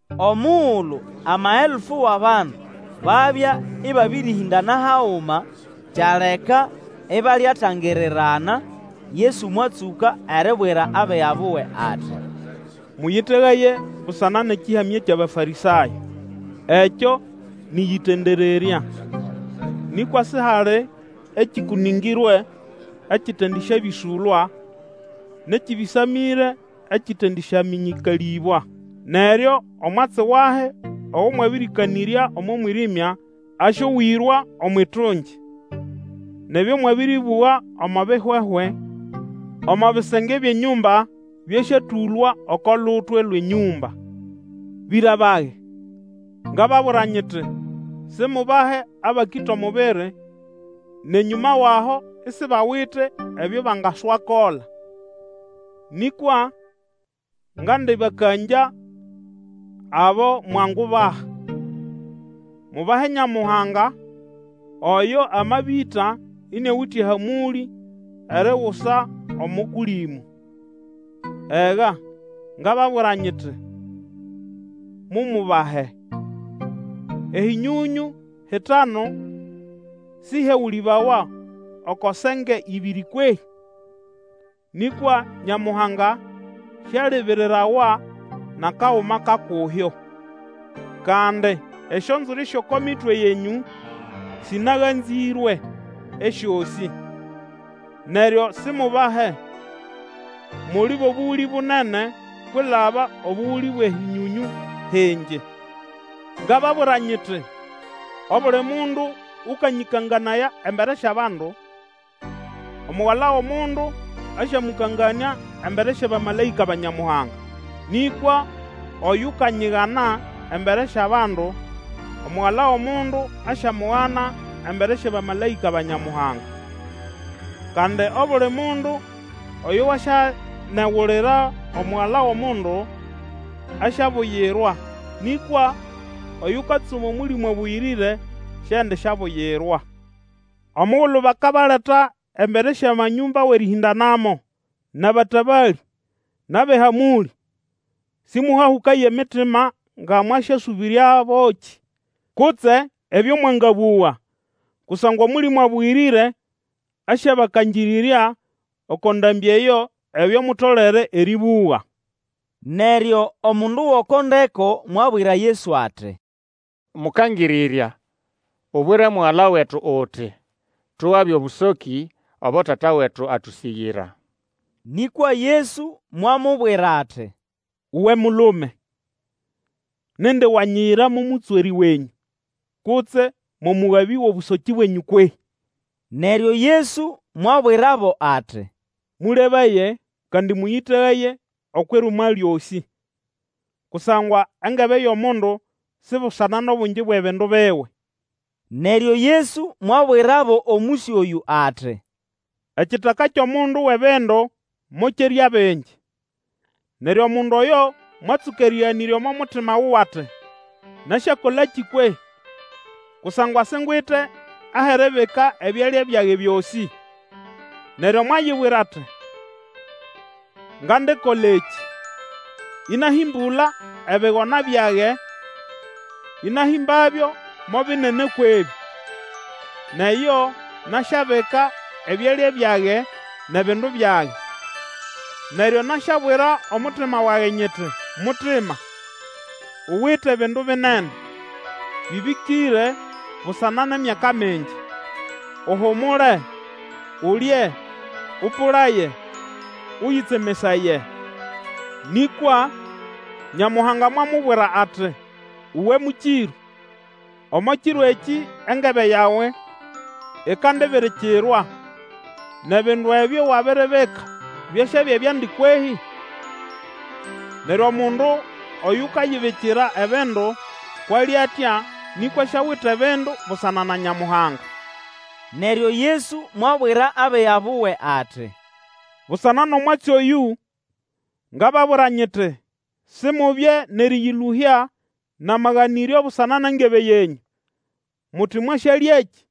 Omugulu amaelfu wʼabandu babya ĩbabĩrĩhĩndana haguma; kyaleka ibalyatangirirana, Yesu mwatsũka eribwira abiga buwe ati, Mũyĩtegaye busana nʼekĩhamya kyʼAbafarĩsayo. Ekyo nĩ ʼyĩtendererya. Nĩkwa sihali ekĩkũnĩngĩrwe ekitendisyabĩsũlwa, nʼekĩbĩsamĩre ekitendisyamĩnyĩkalĩbwa. Neryo omwatsi wahi ogo mwabĩrĩkanĩrya omo mwirĩmya asyowĩrwa omwʼitungi, nʼebyo mwabĩrĩbũga omo bihwehwe omo bisenge byʼenyũmba byasyatũlwa oko lutwe lwʼenyũmba. Twangubahandi? Bĩra bage, ngababwira nyiti, simubahe abakĩta omubiri, nʼenyũma wʼaho isibawite ebyo bangaswakola. Nĩkwa ngandĩbakangya abo mwangubaha: Mubahe Nyamuhanga, oyo amabĩta, iniawite ehamũlĩ erigusa omo Kũlĩmũ. Ega, ngababwira nyiti, mumubahe! Ehĩnyonyũ hitanu sĩhyegũlĩbawa oko senge ĩbĩrĩ kwehĩ? Nĩkwa Nyamuhanga Sialibirirawa nʼakaguma ka kuhyo. Kandi esyonzwiri syʼoko mitwe yenyũ sĩnaganzĩrwe esyosĩ. Neryo simubahe, muli bʼobũgũlĩ bunene kwilaba obũgũlĩ bwʼehĩnyonyũ hingi. Ngababwira, nyiti, obuli mundu ũkanyĩkanganaya embere syʼabandu, Omugala wʼOmundu asyamũkanganĩa embere syʼabamalaĩka ba Nyamuhanga. Nĩkwa oyukanyigana embere syʼabandu, Omugala wʼOmundu asyamugana embere syʼabamalaĩka ba Nyamuhanga. Kandi obuli mundu oyo wasyanegulira Omugala wʼOmundu, asyabuyirwa; nĩkwa oyukatsuma Omũlĩmũ Abũyĩrĩre, siendisyabuyirwa. Omugulu bakabaleta embere syʼamanyũmba wʼerĩhĩndanamo, nʼabatabalĩ, nʼabʼehamũlĩ, sĩmũhahũkaye emitima nga mwasyasũbĩrya bokĩ, kutse ebyo mwangabũga. Kusangwa Omũlĩmũ Abũyĩrĩre asyabakangĩrĩrya oko ndambĩ eyo ebyo mutolere erĩbũga. Neryo omundu gʼoko ndeko mwabwira Yesu ati, Mũkangĩrĩrya, ubwire mugala wetu uti, tugabe obũsokĩ obo tata wetu atũsĩgĩra. Nĩkwa Yesu mwamubwira ati, Uwe mulume, nindi wanyiyira mo mũtswerĩ wenyũ, kutse mo mũgabĩ wʼobũsokĩ bwenyũ kwehĩ? Neryo Yesu mwabwirabo ati, Mũlebaye, kandi mũyĩtegaye okwʼirumwa lyosĩ, kusangwa engebe yʼomundu si busana nʼobungi bwʼebindu biwe. Neryo Yesu mwabwirabo omũsyo oyũ ati, Ekitaka kyʼomundu wʼebindu mokyerya bingi. Neryo omundu oyo mwatsũka erĩganĩrya omo mutima wuwe ati, Nasyakolakĩ kwehĩ? Kusangwa singwite ahʼeribika ebyalya byage byosĩ. Neryo mwayibwira ati, Ngandikola ekĩ: ĩnahĩmbũla ebigona byage, ĩnahĩmbabyo mo binene kwʼebĩ, nʼeyo, nasyabika ebyalya byage nʼebindu byage. Neryo nasyabwira omutima wage nyiti, Mutima, uwite bindu binene bĩbĩkĩre busana nʼemyaka mingi. Uhumule, ulye, Ũpũlaye, ũyĩtsemesaye. Nĩkwa Nyamuhanga mwamubwira ati, Uwe mũkĩrũ, omo kiro ekĩ engebe yawe ikandibirikirwa, nʼebindu ebyo wabiribika byasyabya byandi kwehĩ? Neryo, omundu oyukayibikira ebindu, kwʼali atya, nĩkwa siawite bindu busana na Nyamuhanga. Neryo Yesu mwabwira abiga buwe ati, Busana nʼomwatsi oyũ ngababwira nyiti, Simubye nʼerĩyĩlũhya nʼamaganĩryo busana nʼengebe yenyũ, muti mwasyalyakĩ,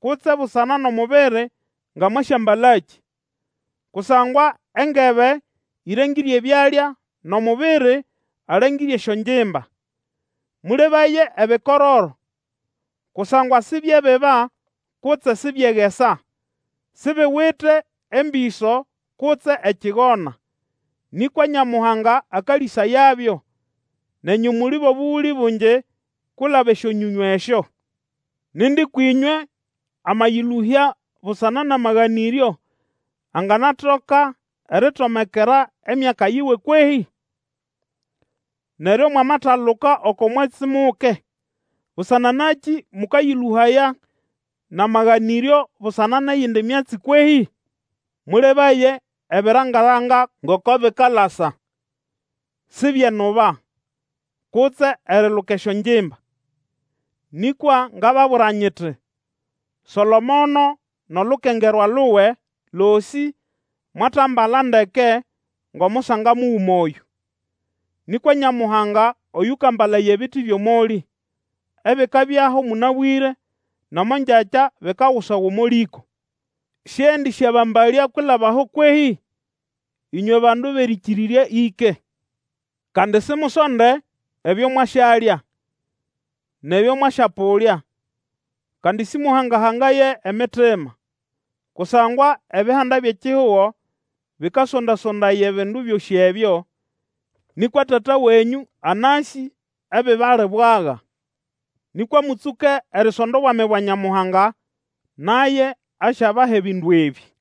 kutse busana nʼomubiri, nga mwasyambalakĩ. Kusangwa engebe ĩrengĩre ebyalya, nʼomubiri alengĩre esyongimba. Mũlebaye ebikororo, kusangwa sibyebiba kutse sibyegesa; wite embĩso kutse ekigona; nĩkwa Nyamuhanga akalĩsayabyo; nenyũ muli bʼobũgũlĩ bungi kwilaba esyonyonyũ esyo! Nindi kwĩnywe amayĩlũhya busana nʼamaganĩryo anganatoka eritomekera emyaka yiwe kwehĩ? Neryo mwamataluka oko mwatsi muke, busana nakĩ mũkayĩlũhaya nʼamaganĩryo busana nʼeyindi myatsi kwehĩ? Mũlebaye ebiranga-ranga, ngoko bikalasa; Sibyenuba, kutse eriluka esyongimba; nikwa ngababwira nyiti, Solomono nʼolukengerwa luwe losĩ mwatambala ndeke ngʼomusanga muguma oyũ. Nĩkwa Nyamuhanga oyũkambalaya ebiti byʼomolĩ, ebikabyaho mũnabwĩre nʼomo ngyakya bikagusawa omo lĩko. Siendisyabambalya kwilaba aho kwehĩ? Ĩnywe bandu bʼerĩkĩrĩrya ĩke. Kandi simusonde ebyo mwasyalya, nʼebyo mwasyapũlya, kandi simuhanga-hangaye emitima. Kusangwa ebihanda byʼekihugo bikasonda-sondaya ebindu byosĩ ebyo, nĩkwa Tata wenyũ anasĩ ebibali bwaga. Nĩkwa mũtsũke erisonda obwami bwa Nyamuhanga, naye asyabaha ebindu ebĩ.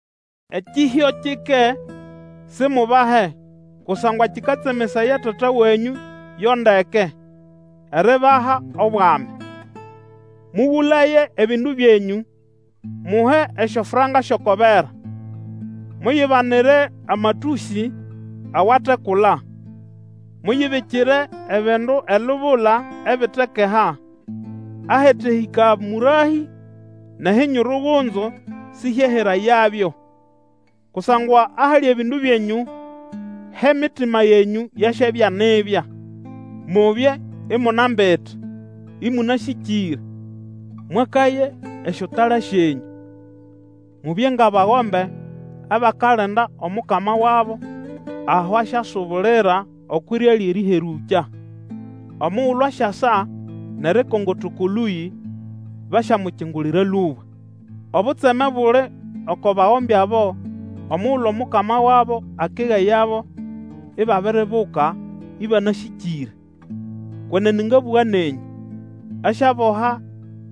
Ekĩhyo kike, simubahe kusangwa kikatsemesaya Tata wenyũ yo ndeke, eribaha Obwami. Mũgũlaye ebindu byenyũ, muhe esyofranka syʼoko bera. Muyibanire amatũsĩ awatekula, muyibikire ebindu elubula ebitekeha, ahatehĩka mũrahĩ, nʼehinyurugunzu sihyeherayabyo. Kusangwa ahali ebindu byenyũ, hʼemitima yenyũ yasyabya nibya. Mubye imunambite, ĩmũnasĩkĩre, mwakaye esyotala syenyũ. Mubye ngʼabagombe abakalinda omukama wabo aho asyasubulira okwʼirya lyʼerĩherũkya. Omugulu asyasa nʼerikongota oko lũyĩ, basyamukingulira lũba. Obutseme buli oko bagombe abo omugulu omukama wabo akegayabo ibabiribuka ĩbanasĩkĩre! Kwenene ngabũga nenyũ, asyaboha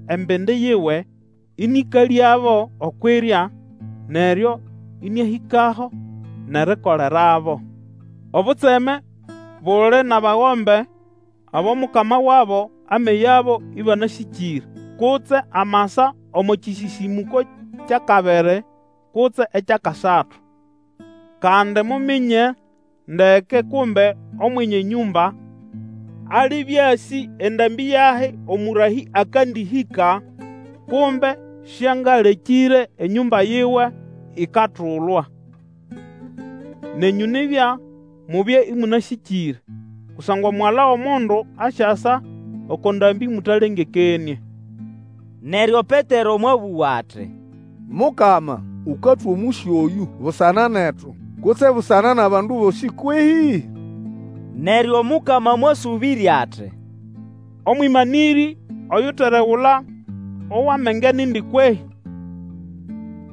embindi yiwe, ĩnĩkalyabo okwʼirya, neryo ĩnĩahĩkaho, nʼerikolerabo. Obutseme buli nʼabagombe abo mukama wabo ameyabo ĩbanasĩkĩre kutse amasa omo kĩsĩsĩmũko kyʼakabiri, kutse ekyʼakasatu. Kandi muminye ndeke kumbe Omwenye nyũmba alibya asĩ endambĩ yahi omũrahĩ akandĩhĩka, kumbe Sĩangalekĩre enyũmba yiwe ikatulwa. Nenyũ nibya, mubye ĩmũnasĩkĩre; kusangwa Omugala wʼOmundu asyasa oko ndambĩ mũtalengekenĩe. Neryo Petero mwabũga ati, Mukama, ũkatwa omũsyo oyũ busana netu, kutse busana nʼabandu bosĩ kwehĩ? Neryo Omukama mwasũbĩrya ati, Omwĩmanĩrĩ oyuteregula owʼamenge nindi kwehĩ?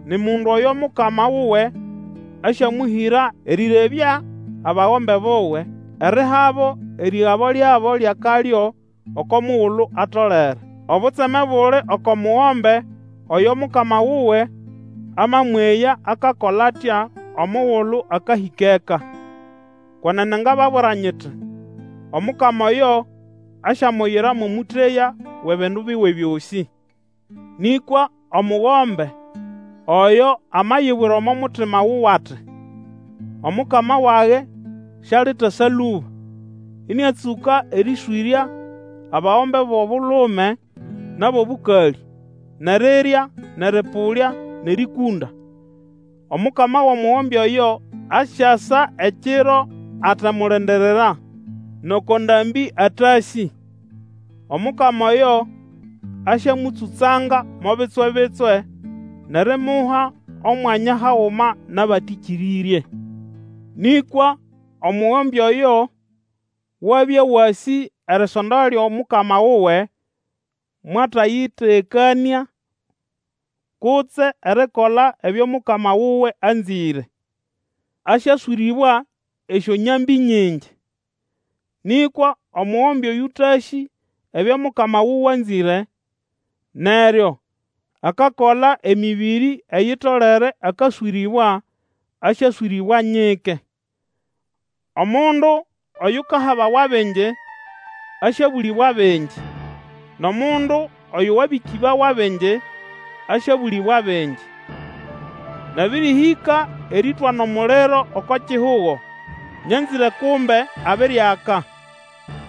Ni mundu oyo mukama wuwe asyamũhĩra erĩrebya abagombe buwe, erihabo erĩgabo lyabo lyʼakalyo oko mugulu atolere. Obutseme buli oko mugombe oyo mukama wuwe amamweya akakola atya omugulu akahĩka eka! Kwenene ngababwira nyiti, Omukama oyo asyamuyira mo mũteya wʼebindu biwe byosĩ. Nĩkwa omugombe oyo amayibwira omo mutima wuwe ati, Omukama wage sialitasa lũba, ĩnĩatsũka erĩswĩrya abagombe bʼobulume nʼabʼobũkalĩ, nʼerirya, nʼerĩpũlya nʼerĩkũnda, omukama wʼomugombe oyo asyasa ekiro atemulindirira, nʼoko ndambĩ atasĩ; omukama oyo asyamũtsũtsanga mo bitswe-bitswe, nʼerimuha omwanya haguma nʼabatĩkĩrĩrye. Nĩkwa omugombe oyo wabya wasĩ erisonda lyʼomukama wuwe mwatayĩtegekanĩa, kutse erikola ebyo mukama wuwe anzĩre, asyaswĩrĩbwa esyonyambĩ nyingi. Nĩkwa omugombe oyũtasĩ ebyo mukama wuwe anzĩre, neryo akakola emĩbĩrĩ eyitolere akaswĩrĩbwa, asyaswĩrĩbwa nyike. Omundu oyukahabawa bingi, asyabũlĩbwa bingiĩ nʼomundu oyo wabĩkĩbawa bingi, asyabũlĩbwa bingi. Nabĩrĩhĩka erĩtwana omuliro oko kihugo; nyanzĩre kumbe abiriaka!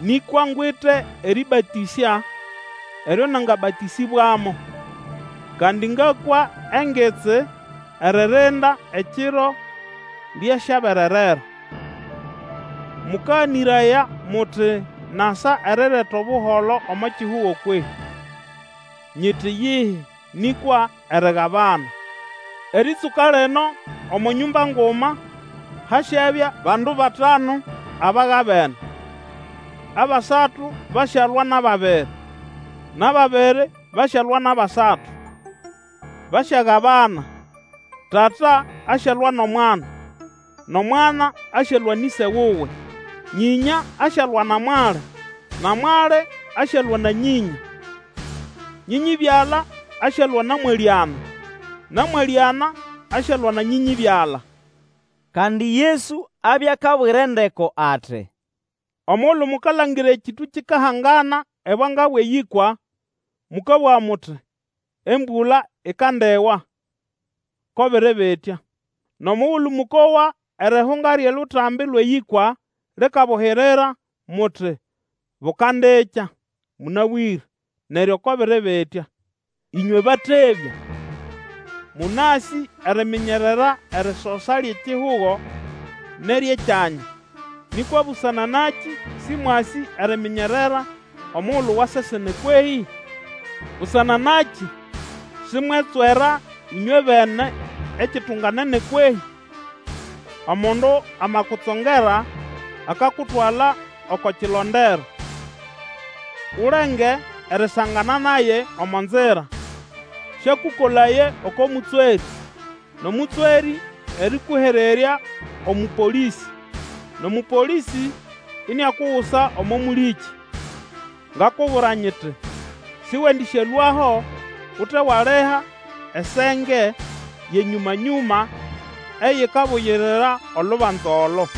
Nĩkwa ngwite erĩbatĩsya eryo nangabatĩsĩbwamo, kandi ngakwa engitsi eririnda ekiro lyasyabererera. Mũkaganĩraya muti nasa erireta Obuholo omo kihugo kwehĩ? Nyiti iyihi, nĩkwa erigabana. Erĩtsũka lino omo nyũmba nguma hasyabya bandu batanu abagabene. Abasatu basyalwa nʼababiri, nʼababiri basyalwa nʼabasatu. Basyagabana, tata asyalwa nʼomwana; nʼomwana asyalwa nʼĩse wuwe; nyĩnya asyalwa na mwali, na mwali asyalwa na nyĩnya; nyĩnyĩ-byala asyalwa na mwalĩana, na mwalĩana asyalwa na nyĩnyĩ-byala. Kandi Yesu abya akabwira endeko ati, Omugulu mukalangira ekĩtũ kikahangana ebwanga bwʼeyĩkwa, mũkabũga muti, embũla ikandiwa, ko biri bitya. Nʼomugulu mũkowa erihunga lyʼeLutambi lwʼeYĩkwa likabuhirira, muti, Bukandikya mũnabwĩre; neryo ko biri bitya. Ĩnywe batebya! Mũnasĩ eriminyerera erisosa lyʼekihugo nʼeryʼekyanya; nĩkwa busana nakĩ sĩmwasĩ eriminyerera omugulu wa sesene kwehĩ? Busana nakĩ simwetswera ĩnywebene ekitunganene kwehĩ? Omundu amakutsongera akakutwala oko kilondero, ulenge erisangana naye omo nzira, sĩakũkolaye oko mũtswerĩ, nʼomũtswerĩ erĩkũhererya omũpolĩsĩ, nʼomũpolĩsĩ iniakugusa omo mũlĩkĩ. Ngakubwira nyiti, Sĩwendĩsyalũaho ute waliha esenge yʼenyũma-nyũma eyikabugirira olubanza olo.